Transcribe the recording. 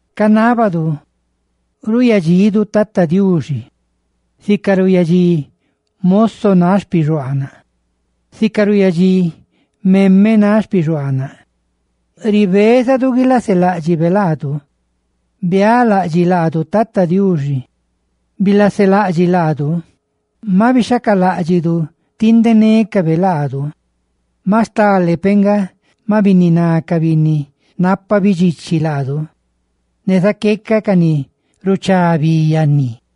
Rinábadu ruuyadxidu Tata Diuxi, Diuxi xtidu, sica ruuyadxí moso náꞌ xpixuaanaꞌ, sica ruuyadxí criada náꞌ xpixuaanaꞌ, ribézadu guilaseláꞌdxibe laadu. Bialaꞌdxiꞌ laadu, Tata Diuxi; bilaselaꞌdxiꞌ laadu, maꞌ bixhacaláꞌdxidu tindenécabe laadu. ¡Maꞌ stale peꞌ nga maꞌ bininá ca binni napa bidxichi laadu ne zaqueca ca ni ruchá bi yanni!